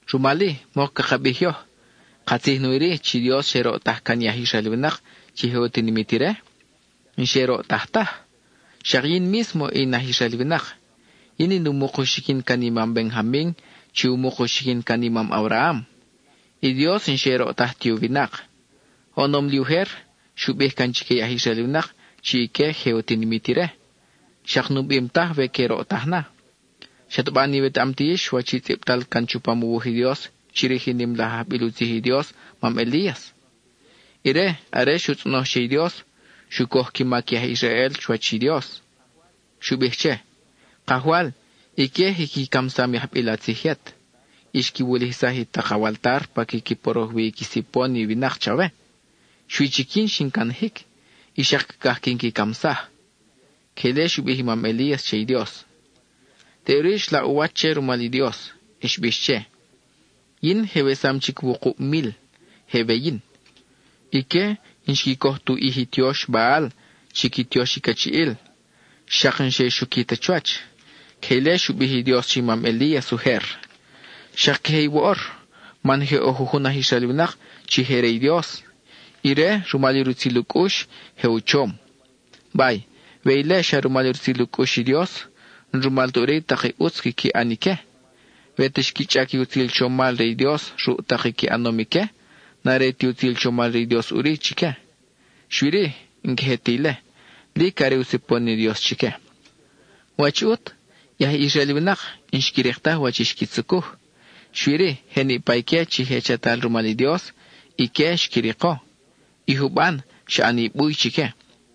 Rumal-i, mok caka bij yoj, ¿Katzij nawi-ri, chi Dios xe roʼtaj can i aj Israel winak, chi je u tinimit ire? N-xe roʼtaj taj. Xak yin mísmo in aj Israel winak. Yin in u muk u xiquin can i mam Benjamin, chi u muk u xiquin can i mam Abraham. I Dios n-xe roʼtaj ti u winak. Oʼonom li ujer, xu bij can chique i aj Israel winak chi ique je u tinimit ire, xak nu bim taj we que roʼtaj na. ¿Xataba n-iwetaʼam ti yix wach i tzʼibtal can chupam u wuj i Dios chirij i nim laj ajbil u tzij i Dios, mam Elías? Ire, are xu tzʼonoj che i Dios, xu coj qui mac i aj Israel chuwach i Dios. Xu bij che: “Kajwal, ique je qui camsam i ajbil a tzij yet, y xqui wulijsaj i tak awaltar pa quiqui poroj wi i qui sipon i winak chawe. Xui chic yin xin canajic, y xak cacaj quin qui camsaj.” (Queje ile xu bij i mam Elías che i Dios.) Teʼuri, xlaʼ u wach che rumal i Dios. Xbix che: “Yin je wesam chic wukub mil, je we yin. Ique n-xqui coj tu ʼij i tiox Baal (chi qui tiox i cachiʼil), xak n-xe xuqui ta chuwach.” (Queje ile xu bij i Dios che i mam Elías ujer.) Xak queje i woʼor, man je ʼo jujun aj Israel winak chi je re i Dios; ire, rumal i rutzil u cʼux, je u chom. Bay, we ile xa rumal i rutzil u cʼux i Dios, n-rumal ta ʼuri i tak i ʼutz quiqui ʼan ique. We ta xqui chʼac i utzil chomal re i Dios ruʼ tak i qui ʼanom ique, n-are ti utzil chomal re i Dios ʼuri chique. Xui-ri, n-queje ti ile; lic are u sipon i Dios chique. ¿Wach ʼut? I aj Israel winak n-xqui rik taj wach i xqui tzucuj, xui-ri, je niʼpa ique chi je chatal rumal i Dios, ique xqui riko; i juban, xa ʼani buy chique.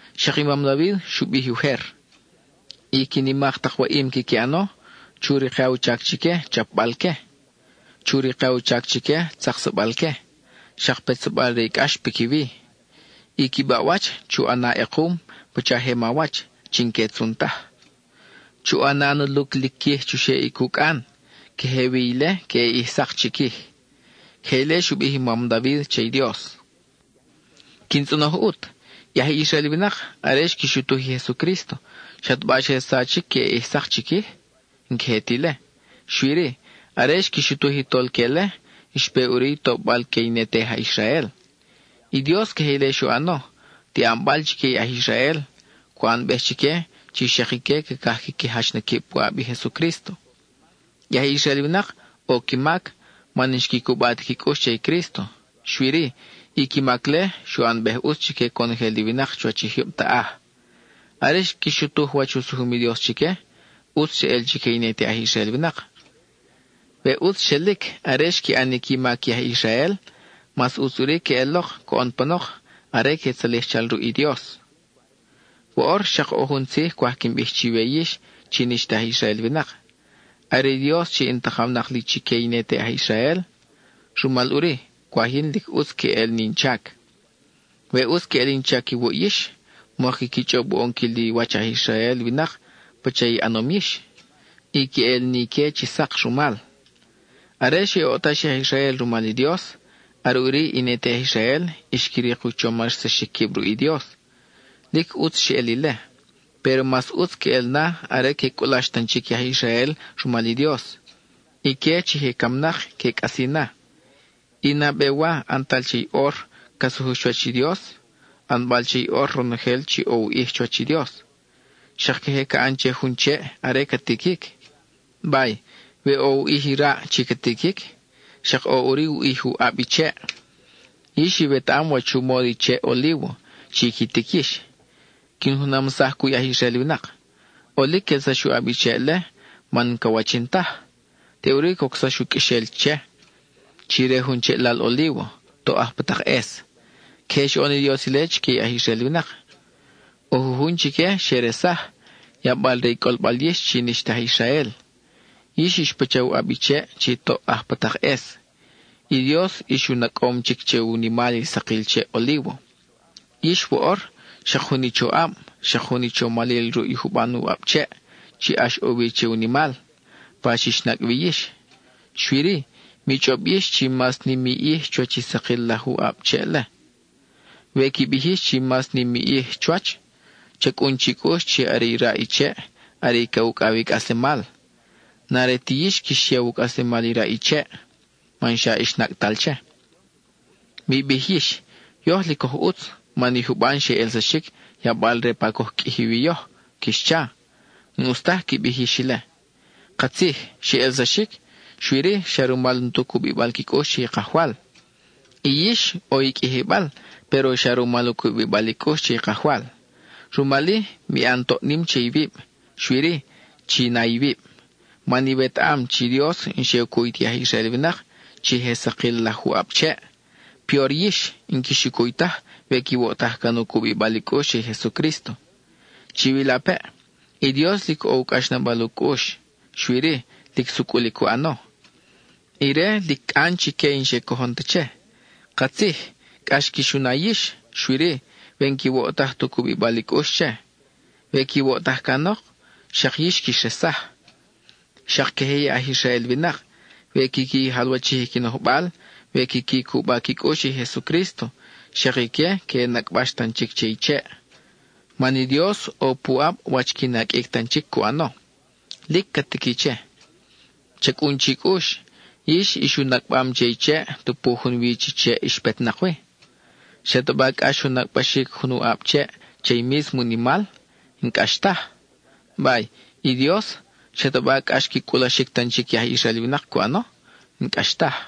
Xak i mam David xu bij ujer: I qui nimak tak waʼim quiqui ʼano, chu rika u chac chique chapbal que, chu rika u chac chique tzaksabal que, xak petsabal re i cʼax piquiwi. I qui baʼwach, chu ʼana ʼekum pacha je mawach, chi n-que tzun taj. Chu ʼana na luclic quij chuxeʼ i cucʼan, queje wi ile queʼe ʼij sak chiquij. (Queje ile xu bij i mam David che i Dios.) Quin tzʼonoj ʼut: I aj Israel winak, are xqui xutuj i Jesucrísto, ¿xataba xe sachic queʼe ʼij sak chiquij? N-queje ti ile. Xui-ri, are xqui xutuj i Tolque-le, xpe ʼuri i tobal que i ne te aj Israel. I Dios queje ile xu ʼano, tiʼan-bal chique i aj Israel, cu ʼanbej chique chi xak ique cacaj quiqui jach na quib puʼab i Jesucrísto. I aj Israel winak, ʼo qui mac, man n-xqui cuba ti qui cʼux che i Crísto; xui-ri, i qui mac-le, xu ʼanbej ʼutz chique conojel i winak chuwach i jyub taʼaj. Are xqui xutuj wach u sujum i Dios chique, ʼutz xeʼel chique i ne te aj Israel winak. We ʼutz xelic are xqui ʼan i qui mac i aj Israel, mas ʼutz ʼuri queʼelok coʼon panok are que tzalij chal ruʼ i Dios. Woʼor xak ʼo jun tzij cwaj quin bij chiwe yix chi n-ix ta aj Israel winak. Are i Dios chi in takawnak li chique i ne te aj Israel, rumal ʼuri, cwaj yin lic ʼutz queʼel in chac. We ʼutz queʼel in chac iwuʼ yix, mok quiqui chʼob u ʼonquil i wach aj Israel winak pacha i ʼanom yix, y que ʼel ni ique chi sak rumal. Are xe oʼtax i aj Israel rumal i Dios, are ʼuri i ne te aj Israel xqui rik u chomarsaxic quib ruʼ i Dios. Lic ʼutz xeʼel ile, péro mas ʼutz queʼel na are que cʼulax tan chic i aj Israel rumal i Dios; ique chi je camnak que cʼasi na. I nabe wa ʼantal che i ʼor ca sujux chuwach i Dios, ʼanbal che i ʼor ronojel chi ʼo u ʼij chuwach i Dios. Xak queje ca ʼan che jun cheʼ are ca tiquic. Bay, we ʼo u ʼij i raʼ chi ca tiquic, xak ʼo ʼuri u ʼij u ʼab i cheʼ. Yix iwetaʼam wach u módo i cheʼ olívo, chi qui tic yix; quin junamsaj cuʼ i aj Israel winak. ʼOlic quelsax u ʼab i cheʼ-le, man n-ca wachin taj; teʼuri cocsax u qʼuexel che, chi re jun u cheʼlal olívo, toʼ aj pa tak ʼes. Queje xoʼon i Dios ile chique i aj Israel winak; ʼo jujun chique xe resaj, yabal-re i cʼolbal yix chi n-ix ta aj Israel. Yix ix pacha u ʼab cheʼ chi toʼ aj pa tak ʼes; i Dios ix u nacʼom chic che u nimal i sakil cheʼ olívo. Yix, woʼor xak jun i choʼab, xak jun i chomal ruʼ i juban u ʼab cheʼ, chi ʼax ʼo wi che u nimal, pa xix nacʼ wi yix. Xui-ri, mi chʼob yix chi mas nim i ʼij chuwach i sakil laj u ʼab cheʼ-le. We qui bij yix chi mas nim i ʼij chuwach, cha cʼun chi cʼux chi are i raʼ i cheʼ are i ca ucʼaw i cʼaslemal; n-are ti yix quix yaw u cʼaslemal i raʼ i cheʼ, man xa ix nacʼtal che. Mi bij yix: “Yoj lic oj ʼutz, man i juban xe ʼelsaxic, yabal-re pa coj qʼuiji wi yoj,” quix cha. N-ʼus taj qui bij yix ile. Katzij, xe ʼelsaxic, xui-ri, xa rumal n-tu cubibal qui cʼux che i Kajwal. Y yix, ʼo i qʼuijibal péro xa rumal u cubibal i cʼux che i Kajwal. Rumal-i, mi ʼan toʼ nim che iwib, xui-ri, chi na iwib. Man iwetaʼam chi Dios n-xe u cuy ti aj Israel winak, chi je sakil laj u ʼab cheʼ, peor yix, n-quix u cuy taj we quiwoʼtaj can u cubibal i cʼux che i Jesucrísto. Chiwilapeʼ, i Dios lic ʼo u cʼaxnabal u cʼux, xui-ri, lic sucʼul i cu ʼano. Ire lic cʼan chique i n-xe cojon ta che. Katzij, cʼax quix u na yix, xui-ri, we n-quiwoʼtaj tu cubibal i cʼux che. We quiwoʼtaj canok, xak yix quix resaj. Xak queje i aj Israel winak, we quiqui jalwachij qui nojbal, we quiqui cuba qui cʼux che i Jesucrísto, xak ique que nacʼbax tan chic che i cheʼ. Man i Dios ʼo puʼab wach qui naqʼuic tan chic cu ʼano. Lic ca tiqui che. Cha cʼun chi cʼux, yix ix u nacʼbam che i cheʼ tupu junwi chi cheʼ ix petnak wi. ¿Xataba cʼax u nacʼbaxic jun u ʼab cheʼ che i mísmo u nimal? N-cʼax taj. Bay, i Dios, ¿xataba cʼax qui cʼulaxic tan chic i aj Israel winak cu ʼano? N-cʼax taj.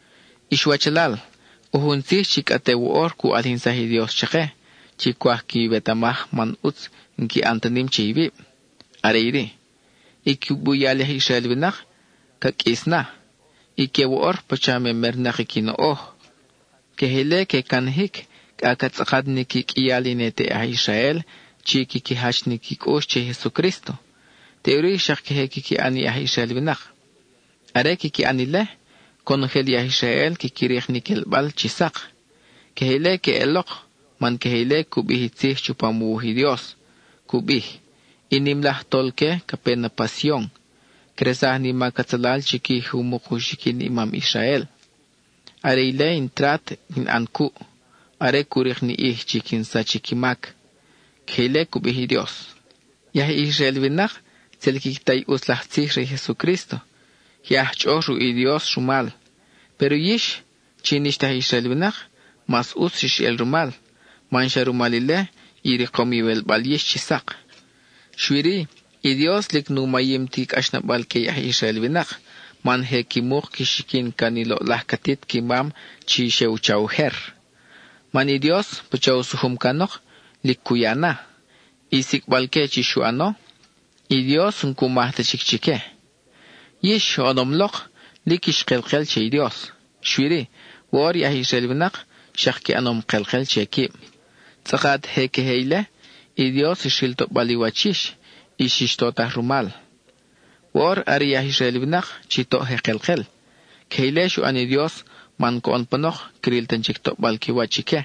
Ix wachalal, ʼo jun tzij chi cʼa te woʼor cu ʼalijinsaj i Dios chake, chi cwaj quiwetamaj man ʼutz n-qui ʼan ta nim che iwib. Are iri: i qui buyal i aj Israel winak ca qʼuis na. Ique woʼor, pacha memernak i qui noʼoj; queje ile que canajic cʼa ca tzʼakat ni qui qʼuial i ne te aj Israel, chi quiqui jach ni qui cʼux che i Jesucrísto. Teʼuri xak queje quiqui ʼan i aj Israel winak. Are quiqui ʼan ile, conojel i aj Israel quiqui rik ni quelbal chi sak. Queje ile queʼelok man queje ile cu bij i tzij chupam u wuj i Dios. Cu bij: I nim laj Tolque ca pe na pa Sion; cresaj ni mac atzalal chiquij i u muk u xiquin i mam Israel. Are ile in trat quin ʼan na cuʼ, are cu rik ni ʼij chi quin sach i qui mac. (Queje ile cu bij i Dios.) I aj Israel winak tzel quiqui ta i ʼutz laj tzij re i Jesucrísto; je aj chʼoʼoj ruʼ i Dios rumal. Péro yix, chi n-ix ta aj Israel winak, mas ʼutz xix el rumal, man xa rumal ile, i rikom iwelbal yix chi sak. Xui-ri, i Dios lic nu mayim ti cʼaxnabal que i aj Israel winak, man je qui muk qui xiquin can i loʼlaj catit qui mam chi xe u cha ujer. Man i Dios, pacha u sujum canok, lic cu ya na. I sicʼbal-que chi xu ʼano, i Dios n-cu maj ta chic chique. Yix, oʼonom lok, lic ix kelkel che i Dios. Xui-ri, woʼor i aj Israel winak xak qui ʼanom kelkel che quib; tzʼakat je queje ile, i Dios xril toʼbal i wach yix, y xix totaj rumal. Woʼor are i aj Israel winak chi toʼ je kelkel; queje ile xu ʼan i Dios man coʼon panok, cril tan chic toʼbal qui wach ique,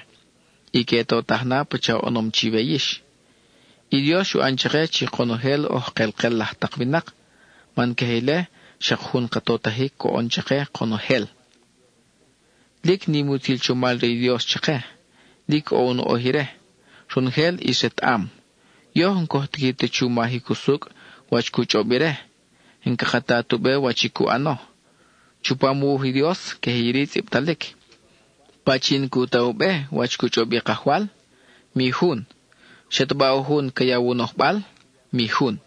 y que totaj na pacha oʼonom chiwe yix. I Dios xu ʼan chake chi konojel oj kelkel laj tak winak, man queje ile xak jun ka totajic coʼon chake konojel. ¡Lic nim i utzil chomal re i Dios chake! Lic ʼo u noʼoj ire; ronojel ʼis retaʼam. Yoj n-coj tiqui ta chu majic usucʼ wach cu chʼob ire; n-caka ta tu be wach i cu ʼano. Chupam u wuj i Dios, queje iri tzʼibtalic: “¿Pachin cu ta u be wach cu chʼob i Kajwal? Mi jun. ¿Xataba ʼo jun ca yaw u nojbal? mi jun.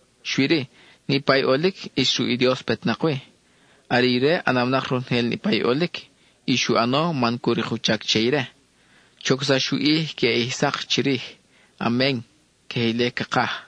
Xui-ri, niʼpa i ʼolic ʼis ruʼ i Dios petnak wi. Are ire ʼanawnak ronojel niʼpa i ʼolic; y xu ʼano man cu rik u chac che ire. Chocsax u ʼij queʼe ʼij sak chirij. Amen (queje ile cakaj).